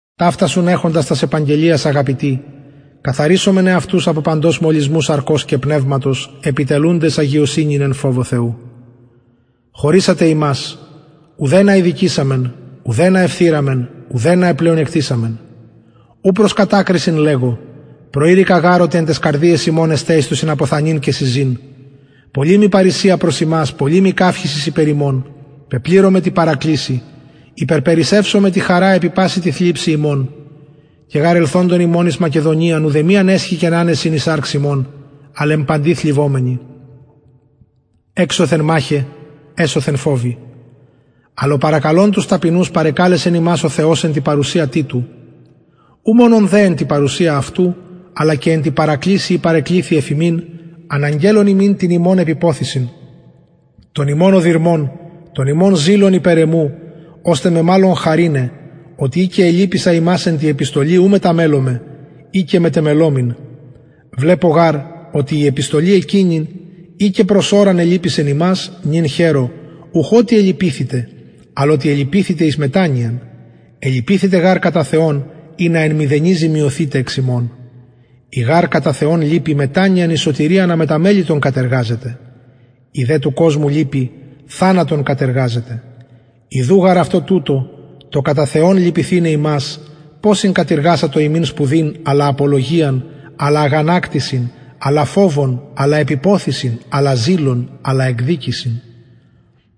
ταυτας ουν εχοντες τας επαγγελιας αγαπητοι καθαρισωμεν εαυτους απο παντος μολυσμου σαρκος και πνευματος επιτελουντες αγιωσυνην εν φοβω θεου χωρησατε ημας ουδενα ηδικησαμεν ουδενα εφθειραμεν ουδενα επλεονεκτησαμεν ου προς κατακρισιν λεγω προειρηκα γαρ οτι εν ταις καρδιαις ημων εστε εις το συναποθανειν και συζην πολλη μοι παρρησια προς υμας πολλη μοι καυχησις υπερ υμων πεπληρωμαι τη παρακλησει υπερπερισσευομαι τη χαρα επι παση τη θλιψει ημων και γαρ ελθοντων ημων εις μακεδονιαν ουδεμιαν εσχηκεν ανεσιν η σαρξ ημων αλλ εν παντι θλιβομενοι εξωθεν μαχαι εσωθεν φοβοι αλλ ο παρακαλων τους ταπεινους παρεκαλεσεν ημας ο θεος εν τη παρουσια τιτου ου μονον δε εν τη παρουσια αυτου αλλα και εν τη παρακλησει η παρεκληθη εφ υμιν αναγγελλων ημιν την υμων επιποθησιν τον υμων οδυρμον τον υμων ζηλον υπερ εμου ωστε με μαλλον χαρηναι οτι ει και ελυπησα υμας εν τη επιστολη ου μεταμελομαι ει και μετεμελομην βλεπω γαρ οτι η επιστολη εκεινη ει και προς ωραν ελυπησεν υμας νυν χαιρω ουχ οτι ελυπηθητε αλλ οτι ελυπηθητε εις μετανοιαν ελυπηθητε γαρ κατα θεον ινα εν μηδενι ζημιωθητε εξ ημων η γαρ κατα θεον λυπη μετανοιαν εις σωτηριαν αμεταμελητον κατεργαζεται η δε του κοσμου λυπη θανατον κατεργαζεται ιδου γαρ αυτο τουτο το κατα θεον λυπηθηναι υμας ποσην κατειργασατο υμιν σπουδην αλλα απολογιαν αλλα αγανακτησιν αλλα φοβον αλλα επιποθησιν αλλα ζηλον αλλα εκδικησιν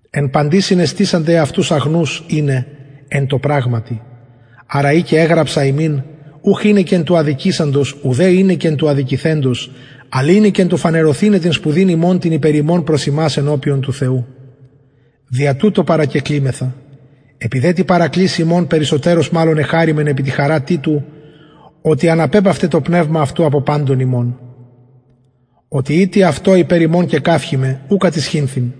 εν παντι συνεστησατε εαυτους αγνους ειναι εν τω πραγματι αρα ει και εγραψα υμιν ουχ εινεκεν του αδικησαντος ουδε εινεκεν του αδικηθεντος αλλ εινεκεν του φανερωθηναι την σπουδην υμων την υπερ ημων προς υμας ενωπιον του θεου δια τουτο παρακεκλημεθα επι δε τη παρακλησει υμων περισσοτερως μαλλον εχαρημεν επι τη χαρα τιτου οτι αναπεπαυται το πνευμα αυτου απο παντων υμων οτι ει τι αυτω υπερ υμων κεκαυχημαι ου κατησχυνθην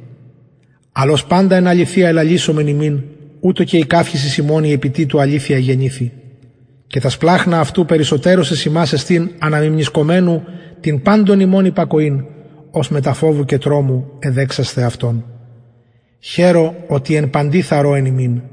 αλλ ως παντα εν αληθεια ελαλησαμεν υμιν ουτως και η καυχησις ημων η επι τιτου αληθεια εγενηθη και τα σπλαγχνα αυτου περισσοτερως εις υμας εστιν αναμιμνησκομενου την παντων υμων υπακοην ως μετα φοβου και τρομου εδεξασθε αυτον χαιρω οτι εν παντι θαρρω εν υμιν